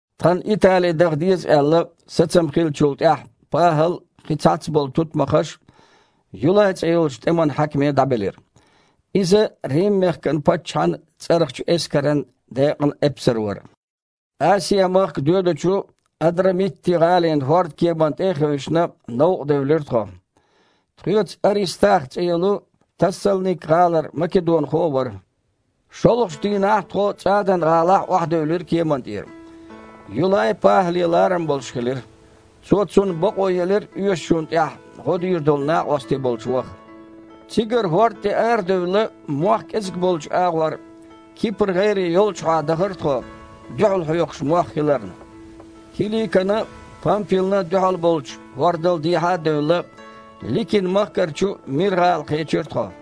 Тхан Итали даха деза аьлла, сацам хиллачул тІаьхьа ПахІал а, кхин цхьацца болу тутмакхаш а Юлай цІе йолчу тІеман хьаькаме дІабелира. Иза Рим-мехкан паччахьан цІарахчу эскаран декъан эпсар вара. Асиа-махка доьдучу Адрамитти-гІалин хІордкеманна тІе а хевшина, новкъадевлира тхо. Тхоьца Арестах цІе йолу Тассалник-гІалара македонхо а вара. ШолгІачу дийнахь тхо ЦІадан-гІалахь охьадевлира кеманна тІера. Юлай ПахІале ларам болуш хилира. Цо цунна бакъо елира оьшучунна тІехь гІо дийр долу накъостий болчу ваха. Цигара хІорда тІе арадевлла, мох кІезиг болчу агІор, Кипр-гІайре йолчухьа дахара тхо, дуьхьал хьоькхуш мох хиларна. Киликана а, Пампилна а дуьхьал болчу хІордал дехьа а девлла, Ликин-махкарчу Мир-гІала кхечира тхо.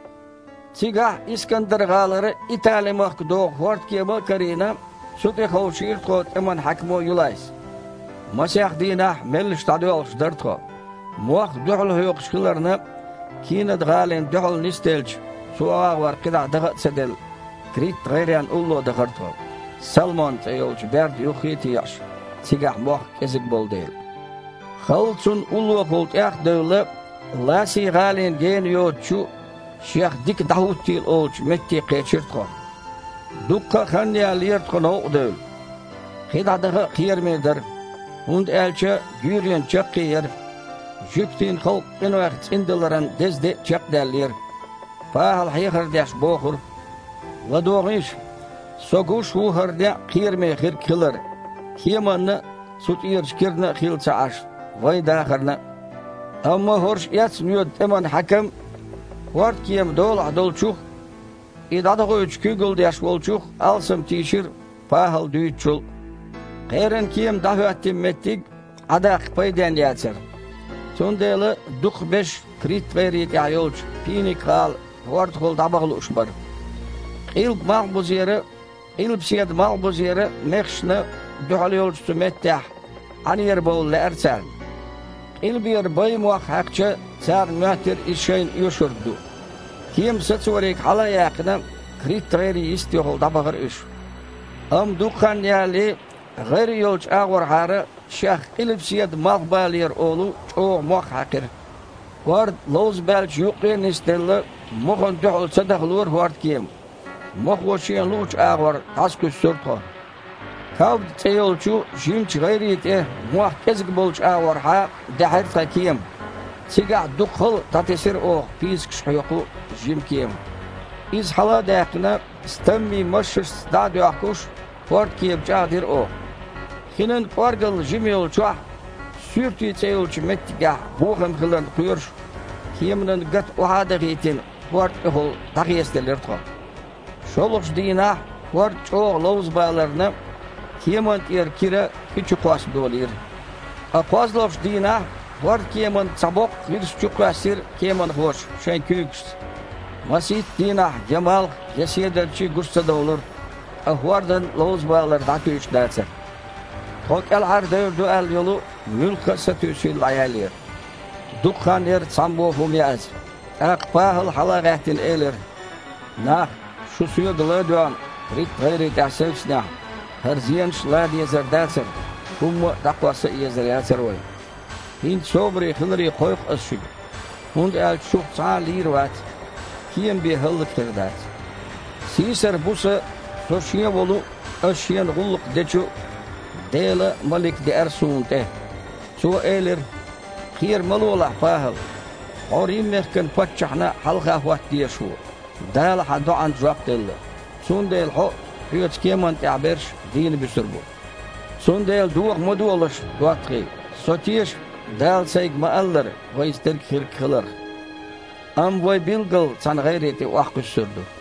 Цигахь Искандар-гІалара Итале-махка догІу хІордкема а карийна, цу тІе ховшийра тхо тІеман хьаькамо Юлайс. Масех дийнахь меллаша дІадоьлхуш дара тхо. Мох дуьхьал хьоькхуш хиларна, Кинад-гІалина дуьхьал нисделча, цу агІор кхидІа даха а ца делла, Крит-гІайренна улло дахара тхо, Салмон цІе йолчу берда юххе а теІаш, цигахь мох кІезиг болу дела. Халла цунна уллохула тІех а девлла, Ласи-гІалина гена йоцучу, шех Дика дІахІуттийла олучу метте кхечира тхо. Дуккха а хан яьллера тхо новкъа девлла. КхидІа даха кхераме дара, хІунда аьлча гуьйренан чаккхе яра, жуьгтийн халкъ къинойх цІиндаларан деза де а чекхдаьллера. ПахІала, хьехар деш, бохура: «ЛадогІийша! Со гуш ву хІара некъ кхераме хирг хилар, кеманна а, цу тІерачу кирана а хилла ца Іаш, вайн дахарна а». Амма хІорш эцна воьду тІеман хьаькам хІордкема долахь долчух а, и дІадохуьйтуш куьйгалла деш волчух а алсам тийшира, ПахІала дуьйцучул а. Кхеран кема дІахІоьттина меттиг Іа даккха пайденна яцара, цундела дукхахберш Крит-гІайре тІехь йолчу Пиника-гІала хІордахула дІабаха лууш бара. Къилба-малхбузера а, къилбаседа-малхбузера а мехашна дуьхьал йолчу цу меттехь Іанера бовла лаьара царна. Къилбера байн мох хьаькхча, царна моьттира иза шайна оьшург ду. Кема сацориг хьала а яьккхина, Крит-гІайре йистехула дІабахара уьш. Амма дукха хан ялале гІайре йолчу агІорхьара шех къилбаседа-малхбалера олу чІогІа мох хьаькхира. ХІорд ловзабаьллачу юккъе а нисделла, мохана дуьхьал ца дахалора хІордкема. Мохо шена луъучу агІор дІасакхуьссура тхо. Кавда цІе йолчу жимачу гІайре тІе, мох кІезиг болчу агІорхьа, даьхьира тхан кема, цигахь дукха хала дІатесира оха пийсакаш хьокху жима кема. Иза, хьала а даьккхина, стаммий машшашца дІа а доьхкуш, хІордкема чІагІдира оха. Хинан кІоргалла жима йолчохь, Суьрти цІе йолчу меттигехь бохам хиларна кхоьруш, кеманан гата охьа а дахийтина, хІорда тІехула дІахецаделира тхо. ШолгІачу дийнахь хІорд чІогІа ловзабаларна, кеманна тІера кира хи чу кхосса долийра. Ткъа кхозлагІчу дийнахь хІордкеманан цхьа боккха гІирс чукхоьссира кеманхоша шайн куьйгашца. Масийтта дийнахь я малх, я седарчий гучу ца довлура, ткъа хІордан ловзабалар дІатуьйш дацара. Тхо кІелхьардевр ду аьлла йолу муьлхха а сатуьйсийла дІаяьллера. Дукха хан яра цхьаммо а хІума яаза. ТІаккха ПахІала, хьала а гІаьттина, элира: «Нах, шу соьга ла а доьгІна, Крит-гІайре тІехь севцнехь, хІара зенаш а лан дезар дацара, хІумма а дІакхосса езар яцара вайн. ХІинца собаре хиларе кхойкху ас шуьга, хІунда аьлча шух цхьа а лийр вац, кема бен хІаллакьхир дац. Сийсара буса со Шен волу а, ас Шена гІуллакх дечу а Делан малик деара суна тІе. Цо элира: „Кхера ма лолахь, ПахІал! Хьо Рим-мехкан паччахьна хьалха хІотта дезаш ву, Дала хьан доІанна жоп делла, цундела хьо а, хьоьца кеманна тІехь берш а дийна буьсур бу“. Цундела доха ма дохалаш, доттагІий, со теша, Дала сайга ма-аллара, вайца дерг хирг хиларх. Амма вай билггала цхьаьна гІайре тІе охьакхуьссур ду».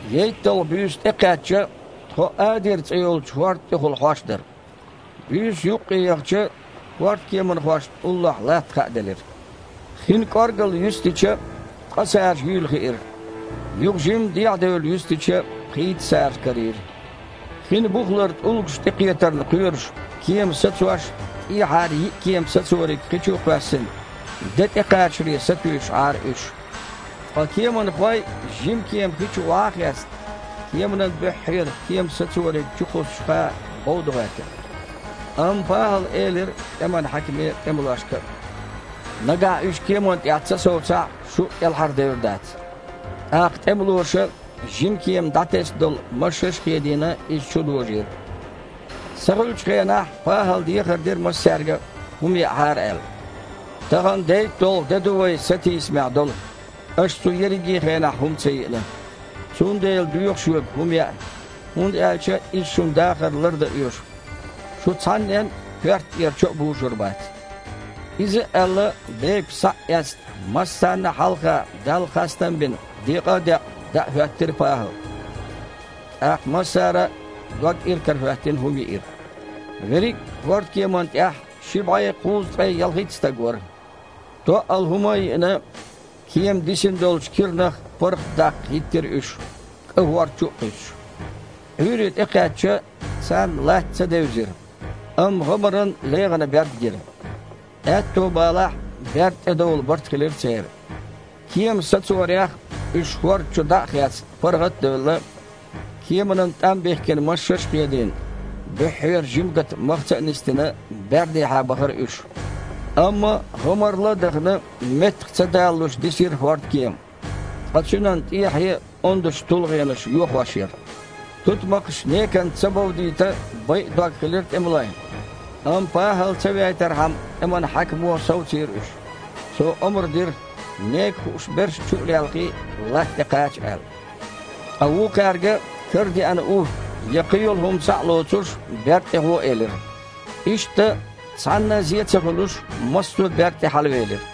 ЕйтталгІа буьйса тІекхаьчча, тхо Адира цІе йолчу хІорда тІехула хьош дара. Буьйса юккъе яхача, хІордкеманхошна уллохь латта хааделира. Хин кІоргалла юьстича, ткъа сажа юьйла хиира. Юха жимма дехьадевлла юьстича, пхийтта сажа карийра. Хин бухулара тІулгаш тІе кхетарна кхоьруш, кема сацош, тІехьара йиъ кема сацориг хи чу а кхоьссина, де тІекхачаре сатуьйсуш Іара уьш. Ткъа кеманхой, жима кема хи чу охьа а хецна, кеманан буьххьера кема сацориг чукхуссучуха, бовда гІоьртира. Амма ПахІала элира тІеман хьаькаме а, тІемалошка а: «Нагахь уьш кеманна тІехь ца совцахь, шу а кІелхьардевр дац». ТІаккха тІемалоша, жима кема дІатесна долу машшаш а хедийна, иза чудожийра. Сахуьлучу хенахь ПахІала дехар дира массаьрга а, хІума яахьара аьлла: «Тахана дейтталгІа де ду вай сатийсамехь долу, аша цу ерриге а хенахь хІума ца йиъна. Цундела доьху шуьга хІума яа, хІунда аьлча иза шуна дахар лардан оьшу. Шу цхьаннен а коьрта тІера чо а бужур бац». Иза а аьлла, бепиг, схьа а эцна, массарна а хьалха Далла хастам а бина, декъа а декъна, даа хІоьттира ПахІал. ТІаккха массара а, дог иракарахІоьттина, хІума йиира. Верриг а хІордкеманна тІехь ши бІе кхузткъе ялхитта стаг вара. Тоъал хІума а йиъна, кема дисина долчу киранах паргІатдаккха хІиттира уьш, кІа хІорда чу а кхуьссуш. Іуьйре тІекхаьчча, царна латта ца девзира, амма гІамаран легІана берд гира. Аьтто балахь берда тІедовла барт хилира церан. Кема сацорех, уьш хІорда чу дІа а хецна, паргІат а девлла, кеманан тІам бихкина машшаш а хедийна, буьххьера жима гата махаца а нисдина, бердехьа бахара уьш. Амма гІамарла а дахана, меттах а ца далалуш дисира хІордкема, ткъа цуьнан тІехье ондачу тулгІенаша йохош яра. Тутмакхаш неканца ца бовдийта байа дог хилира тІемалойн. Амма ПахІал ца вейтархьама тІеман хьаькамо совцийра уьш. Цо омра дира, нека хууш берш, чу а лелхий, лаьтта тІе кхача аьлла. Ткъа вукхаьрга, карадеана у я кхин йолу хІума схьа а лоцуш, берда тІе гІо элира. Иштта, цхьанна а зе ца хуьлуш, массо а берда тІе хьалавелира.